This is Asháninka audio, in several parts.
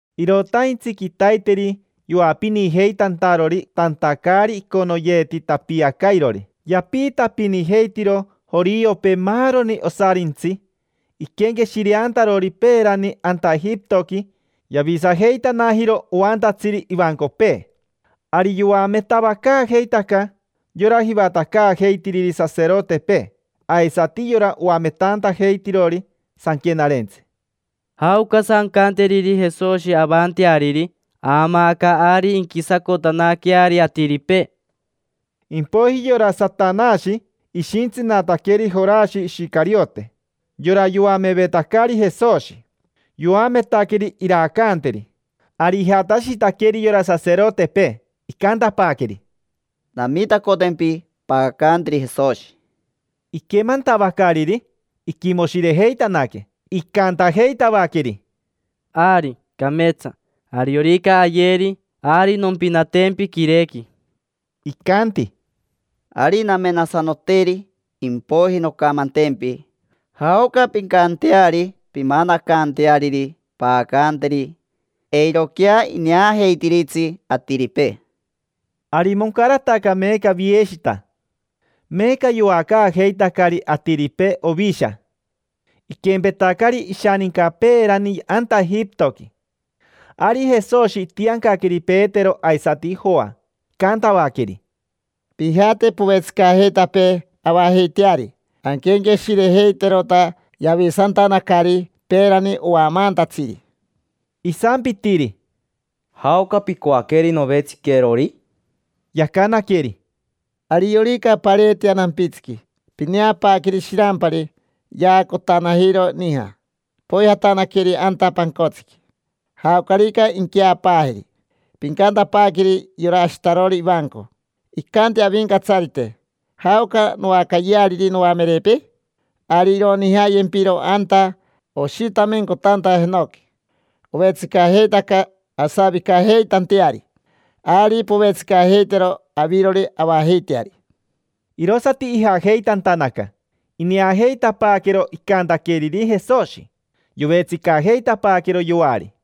Irotaintsi quitaiteri yoapinijeitantarori tanta caari iconoyeeti tapiacairori. Yapiitapinijeitiro joriopee maaroni osarintsi iquenqueshireantarori peerani anta Ejipitoqui yavisajeitanajiro oantatsiri ivancopee. Ari yoametavacaajeitaca yora jivatacaajeitiriri saserotepee aisati yora oametantajeitirori sanquenarentsi: —¿Jaocasa ancanteriri Jesoshi avanteariri? Aamaaca ari inquisacotanaqueari atiripee. Impoiji yora Satanashi ishintsinataqueri Jorashi Ishicariote, yora yoamevetacari Jesoshi: yoametaqueri iraacanteri. Ari ijatashitaqueri yora saserotepee, icantapaaqueri: —Namitacotempi paacanteri Jesoshi. Iquemantavacariri, iquimoshirejeitanaque, icantajeitavaqueri: —Ari, cameetsa. Ariorica ayeri, ari nompinatempi quirequi. Icanti: —Ari. Namenasanoteri, impoiji noncamantempi jaoca pincanteari pimanacanteariri paacanteri. Eiroquea ineajeitiritsi atiripee. Ari moncarataca meeca vieshita. Meeca yoacaajeitacari atiripee ovisha, iquempetacari ishaninca peerani anta Ejipitoqui. Ari Jesoshi itiancaqueri Petero aisati Joa, icantavaqueri: —Pijate povetsicajeitapee avajeiteari, anquenqueshirejeiterota yavisantanacari peerani oamaantatsiri. Isampitiri: —¿Jaoca picoaqueri novetsiquerori? Yacanaqueri: —Ariorica pareetea nampitsiqui, pineapaaqueri shirampari yaacotanajiro nija. Poijatanaqueri anta pancotsiqui, jaocarica inqueapaajeri. Pincantapaaqueri yora ashitarori ivanco: “Icanti Avincatsarite: ‘¿Jaoca noacayeariri noamerepee?’” Ari ironijayempiro anta oshitamencotanta jenoqui. Ovetsicajeitaca asavicajeitanteari. Ari povetsicajeitero avirori avajeiteari. Irosati ijajeitantanaca, ineajeitapaaquero icantaqueriri Jesoshi. Yovetsicajeitapaaquero yoari.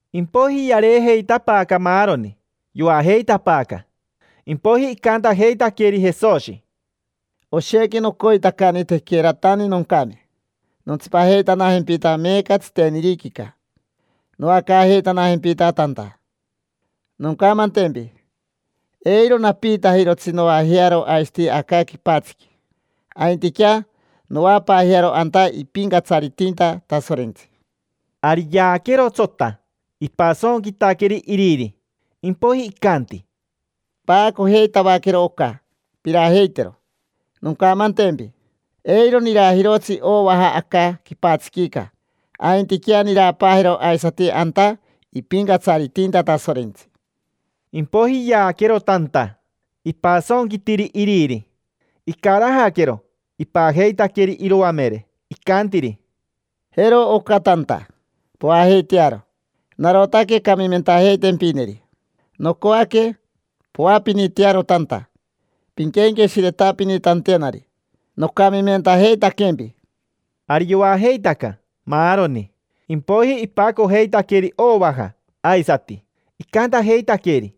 Impoiji yareejeitapaaca maaroni, yoajeitapaaca. Impoiji icantajeitaqueri Jesoshi: —Oshequi nocoitacani tequeratani noncame, nontsipajeitanajempita meeca tsiteniriquica noacaajeitanajempita tanta. Noncamantempi, eiro napiitajirotsi noajearo aisati aca quipatsiqui. Aintiquea noapaajearo anta ipincatsaritinta Tasorentsi. Ari yaaquero tsota, ipasonquitaqueri Iriri, impoiji icanti: —Paacojeitavaquero oca, pirajeitero. Noncamantempi: eiro nirajirotsi ovaja aca quipatsiquica. Aintiquea nirapaajero aisati anta ipincatsaritinta Tasorentsi. Impoiji yaaquero tanta, ipasonquitiri Iriri. Icarajaquero, ipajeitaqueri iroamere, icantiri: —Jero oca tanta, poajeitearo. Narotaque camimentajeitempineri. Nocoaque poapinitearo tanta pinquenqueshiretapinitantenari nocamimentajeitaquempi. Ari yoajeitaca, maaroni. Impoiji ipacojeitaqueri ovaja aisati. Icantajeitaqueri: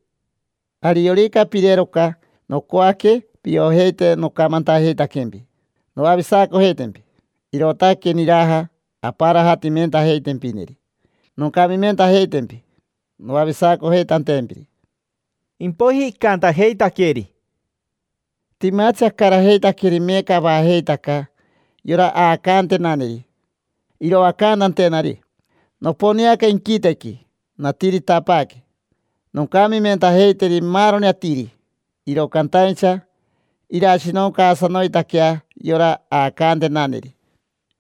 —Ariorica pirero oca, nocoaque piojeite nocamantajeitaquempi noavisacojeitempi. Irootaque niraja amparajatimentajeitempineri, noncamimentajeitempi noavisacojeitantempiri. Impoiji icantajeitaqueri: —Timatsi acarajeitaqueri meeca avajeitaca yora aacantenaneri iroacantantenari. Noponeaca inquitequi, natiritapaaque noncamimentajeiteri maaroni atiri, iro cantaincha irashinoncaasanoitaquea yora aacantenaneri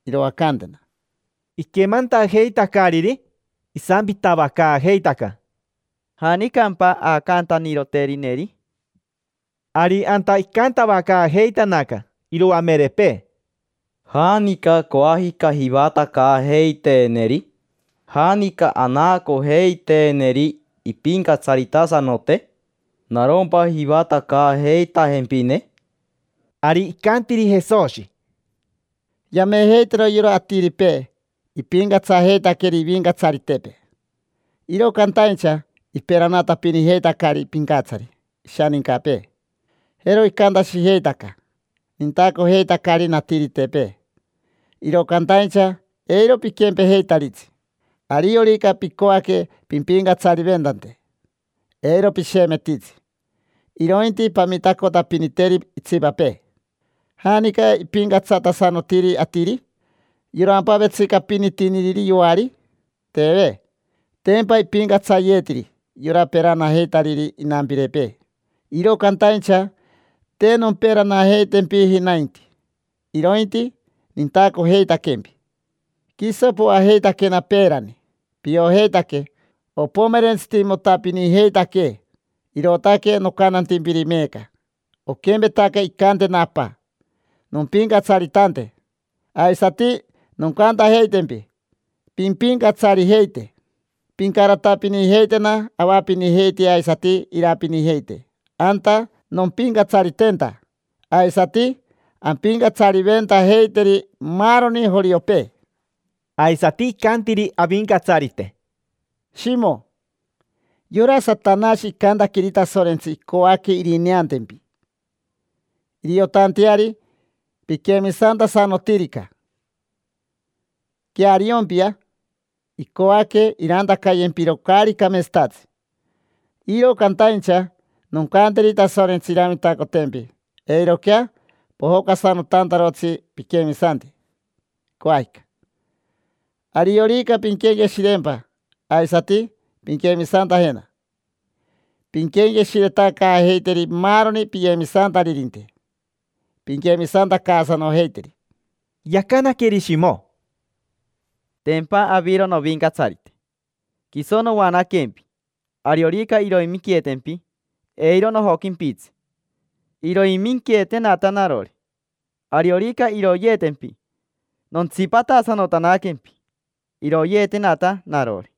iroacantena. Iquemantajeitacariri, isampitavacaajeitaca: —¿Janicampa aacantaniroterineri? Ari anta icantavacaajeitanaca iroamerepee: —¿Janica coajica jivatacaajeiteeneri? ¿Janica anaacojeiteeneri impincatsaritasanote? ¿Naroitatsimpa jivatacaajeitajempine? Ari icantiri Jesoshi: —Yamejeitaro yora atiripee ipincatsajeitaqueri ivincatsaritepee, iro cantaincha iperanatapinijeitacari pincatsari ishanincapee. Jero icantashijeitaca: “Nintacojeitacari natiritepee”. Iro cantaincha eiro piquempejeitaritsi. Ariorica picoaque pimpincatsariventante, eiro pishemetitsi, irointi pamitacotapiniteri itsipapee. ¿Janica ipincatsatasanotiri atiri? ¿Yorampa vetsicapinitiniriri yoari? Teve. Tempa ipincatsayeetiri yora peranajeitariri inampirepee. Iro cantaincha te nomperanajeitempiji nainti, irointi nintacojeitaquempi. Quiso poajeitaquena peerani, piojeitaque opomerentsitimotapinijeitaquee. Irootaque nocantantimpiri meeca: oquempetaca incantena Apa nompincatsaritante, aisati noncantajeitempi pimpincatsarijeite. Pincaratapinijeitena avapinijeitea aisati irapinijeite anta nompincatsaritenta, aisati ampincatsariventajeiteri maaroni joriopee. Aisati icantiri Avincatsarite: —Shimo, yora Satanashi icantaqueri Tasorentsi icoaque irineantempi, iriotanteari piquemisantasanotirica. Queariompia, icoaque irantacayempiro caari cameetsatatsi. Iro cantaincha noncanteri Tasorentsi iramitacotempi eiroquea pojocasanotantarotsi piquemisanti. Coajica, ariorica pinquenqueshirereempa aisati pinquemisantajena, pinquenqueshiretacaajeiteri maaroni piyemisantaririnte, pinquemisantacaasanojeiteri. Yacanaqueri Shimo: —Tempa aviro novincatsarite, quiso noanaquempi; ariorica iroiminqueetempi, eiro nojoquimpitsi. Iroiminqueetenata narori. Ariorica iroyeetempi, nontsipatasanotanaquempi. Iroyeetenata narori.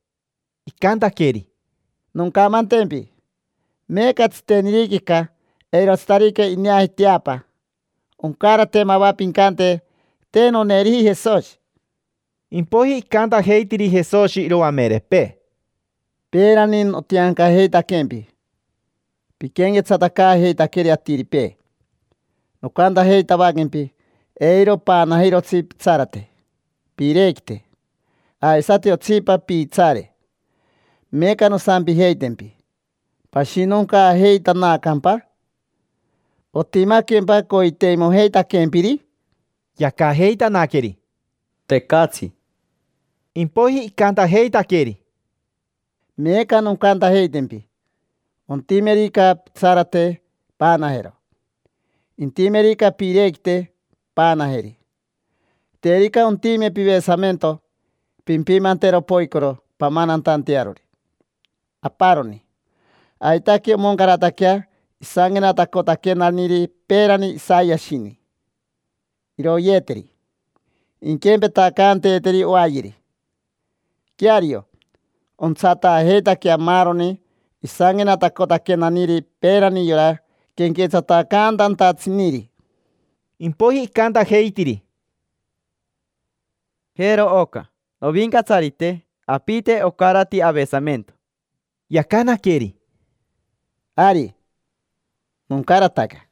Icantaqueri: —Noncamantempi: meeca tsiteniriquica, eirotsitarica ineaji teapa, oncarate mava pincante: “Te noneeriji Jesoshi”. Impoiji icantajeitiri Jesoshi iroamerepee: —Peerani notiancajeitaquempi piquenquetsatacaajeitaqueri atiripee. Nocantajeitavaquempi: “Eiro paanajirotsi pitsarate, piirequite, aisati otsipa piitsaare”. Meeca nosampijeitempi: “¿Pashinoncaajeitanacampa? ¿Otimaquempa coiteimojeitaquempiri?” Yacajeitanaqueri: —Te. Tecatsi. Impoiji icantajeitaqueri: —Meeca noncantajeitempi: ontimerica pitsarate, paanajero. Intimerica piirequite, paanajeri. Terica ontime pivesamento, pimpimantero poicoro pamanantantearori aparoni. Aitaque omoncarataquea isanquenatacotaquenaniri peerani Isayashini: “Iroyeeteri, inquempetacanteeteri oayeri”. Queario, ontsataajeitaquea maaroni isanquenatacotaquenaniri peerani yora quenquetsatacantantatsiniri. Impoiji icantajeitiri: —Jero oca, Novincatsarite: apite ocarati avesamento. Yacanaqueri: —Ari, moncarataca.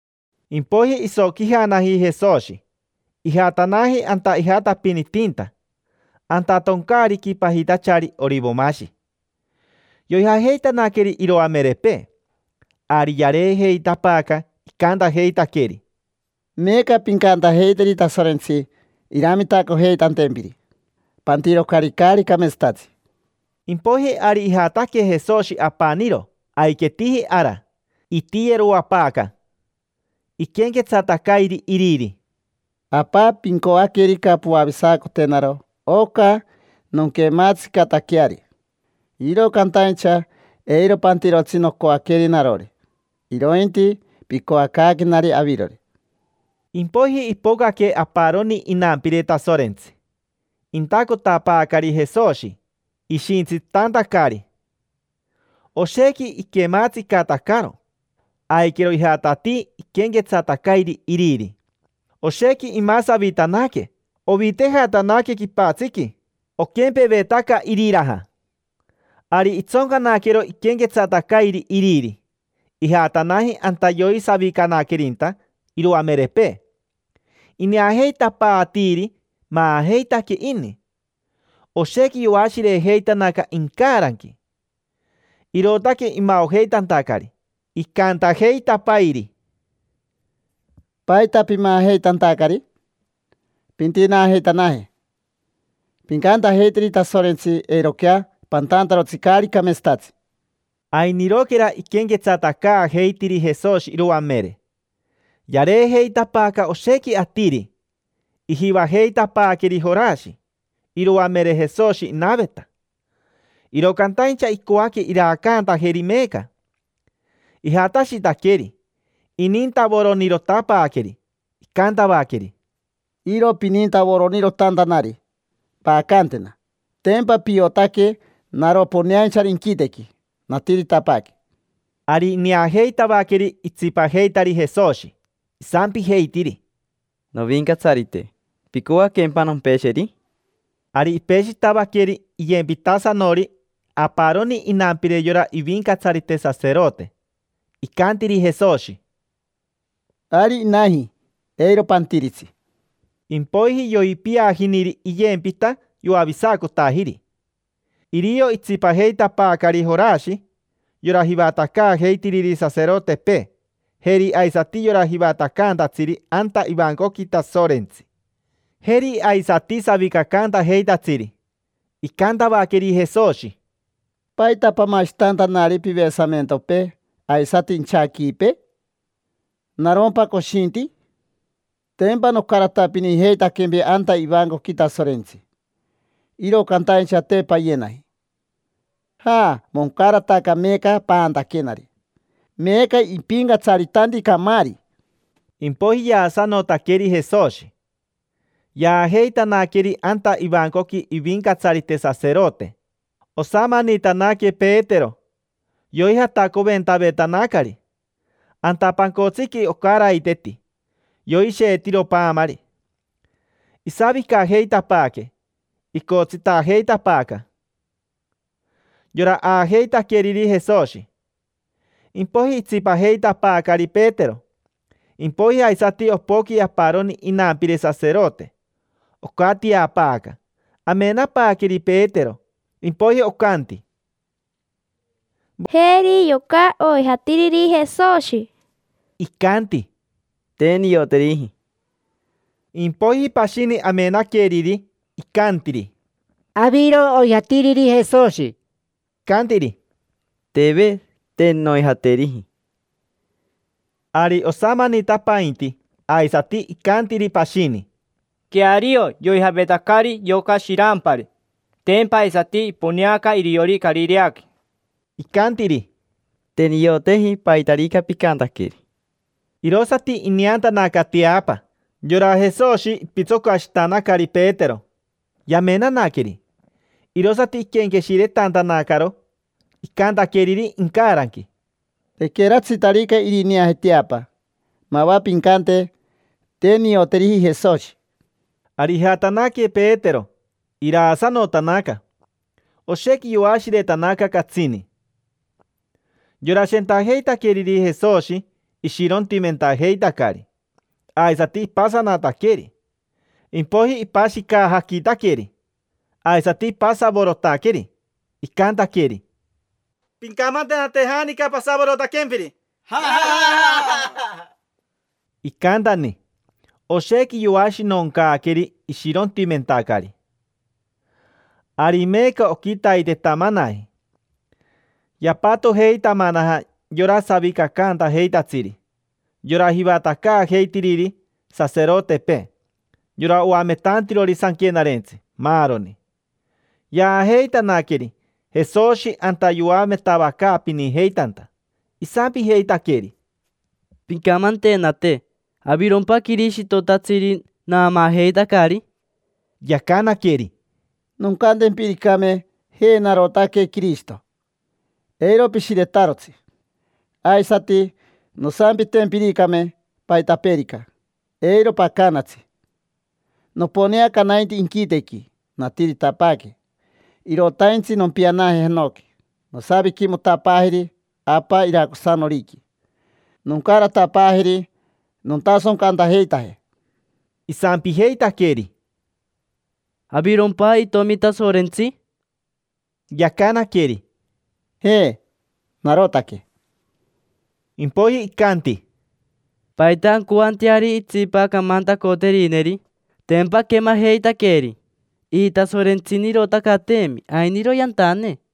Impoiji isoquijanaji Jesoshi, ijatanaji anta ijatapinitinta: anta toncaariqui pajitachari Orivomashi. Yoijajeitanaqueri iroamerepee. Ari yareejeitapaaca, icantajeitaqueri: —Meeca pincantajeiteri Tasorentsi iramitacojeitantempiri: pantirocari caari cameetsatatsi. Impoiji ari ijataque Jesoshi apaniro aiquetiji ara. Itiyeroapaaca, iquenquetsatacairi Iriri: —Apa, pincoaquerica, poavisacotenaro oca nonquematsicataqueari. Iro cantaincha eiro pantirotsi nocoaqueri narori, irointi picoacaaquenari avirori. Impoiji ipocaque aparoni inampire Tasorentsi, intacotapaacari Jesoshi, ishintsitantacari. Oshequi iquematsicatacaro, aiquero ijatatii iquenquetsatacairi Iriri. Oshequi imasavitanaque, ovitejatanaque quipatsiqui, oquempevetaca iriraja. Ari itsoncanaquero iquenquetsatacairi iriri, ijatanaji anta yoisavicanaquerinta iroamerepee, ineajeitapaatiiri maajeitaque ini. Oshequi yoashirejeitanaca incaranqui, irootaque imaojeitantacari. Icantajeitapairi: —¿Paita pimaajeitantacari? Pintinaajeitanaje. Pincantajeiteri Tasorentsi eiroquea pantantarotsi caari cameeetsatatsi. Ainiroquera iquenquetsatacaajeitiri Jesoshi iroamere, yareejeitapaaca oshequi atiri, ijivajeitapaaqueri Jorashi. Iroamere Jesoshi inaveta, iro cantaincha icoaque iraacantajeri meeca. Ijatashitaqueri, inintavoronirotapaaqueri. Icantavaqueri: —Iro pinintavoronirotantanari, paacantena. Tempa piotaque naro poneainchari inquitequi, natiritapaaque. Ari ineajeitavaqueri itsipajeitari Jesoshi. Isampijeitiri: —Novincatsarite, ¿picoaquempa nompesheri? Ari ipeshitavaqueri iyempitasanori aparoni inampire yora ivincatsarite saserote, peti. Icantiri Jesoshi: —Ari inaji, eiro pantiritsi. Impoiji yoipiajiniri iyempita, yoavisacotajiri. Irio itsipajeitapaacari Jorashi yora jivatacaajeitiriri saserotepee, jeri aisati yora jivatacaantatsiri anta ivancoqui Tasorentsi, jeri aisati savicacaantajeitatsiri. Icantavaqueri Jesoshi: —¿Paita pamashitantanari pivesamentopee aisati inchaquipee? ¿Narompa coshinti? Tempa nocaratapinijeitaquempi anta ivancoqui Tasorentsi, iro cantaincha te payenaji. Ja, moncarataca meeca paantaquenari: meeca ipincatsaritanti camaari. Impoiji yaasanotaqueri Jesoshi, shepi. Yaajeitanaqueri anta ivancoqui ivincatsarite saserote. Osamanitanaque Petero, yoijatacoventavetanacari. Anta pancotsiqui, ocaraiteti, yoisheetiro paamari. Isavicajeitapaaque, icotsitajeitapaaca yora aajeitaqueriri Jesoshi. Impoiji itsipajeitapaacari Petero. Impoiji aisati, opoqui aparoni inampire saserote. Ocatiapaaca, amenapaaqueri Petero, sorerere. Impoiji ocanti: —Jeri yoca oijatiriri Jesoshi. Icanti: —Te nioteriji. Impoiji pashini amenaqueriri, icantiri: —Aviro oijatiriri Jesoshi. Icantiri: —Teve. Te noijateriji. Ari osamanitapainti aisati, icantiri pashini: —Queario yoijavetacari yoca shirampari, tempa aisati iponeaca iriori Carireaqui. Icantiri: —Te nioteji paitarica picantaqueri. Irosati ineantanaca teapa. Yora Jesoshi ipitsocashitanacari Petero, yamenanaqueri. Irosati iquenqueshiretantanacaro icantaqueriri incaranqui: “Tequeratsitarica irineaje teapa, mava pincante: ‘Te nioteriji Jesoshi’”. Ari ijatanaque Petero, iraasanotanaca, jii, jii. Oshequi yoashiretanaca, catsini. Yora shentajeitaqueriri Jesoshi ishirontimentajeitacari, aisati ipasanataqueri, tac, tac, tac. Impoiji ipashicajaquitaqueri aisati ipasavorotaqueri, icantaqueri: —Pincamantenate janica pasavorotaquempiri. Iji, iji, iji. Icantani, oshequi yoashinoncaaqueri, ishirontimentacari. Ari meeca oquitaitetamanaji. Yapatojeitamanaja yora savicacantajeitatsiri, yora jivatacaajeitiriri saserotepee, yora oametantirori sanquenarentsi, maaroni. Yaajeitanaqueri Jesoshi anta yoametavacaapinijeitanta. Isampijeitaqueri: —Pincamantenate: ¿avirompa Quirishitotatsiri naamaajeitacari? Yacanaqueri: —Noncantempiricame: “Je, narotaque Quirishito”, eiro pishiretarotsi. Aisati, nosampitempiricame paitapeerica, eiro pacanatsi. Noponeaca nainti inquitequi, natiritapaaque. Irotaintsi nompianaje jenoqui, nosaviquimotapaajeri Apa iracosanoriqui, noncaratapaajeri nontasoncantajeitaje. Isampijeitaqueri: —¿Avirompa Itomi Tasorentsi? Yacanaqueri: —Je, narotaque. Impoiji icanti: —¿Paita ancoanteari itsipa camantacoterineri? Tempa aquemajeitaqueri, ijitasorentsinirotacateemi. Ainiro yantane.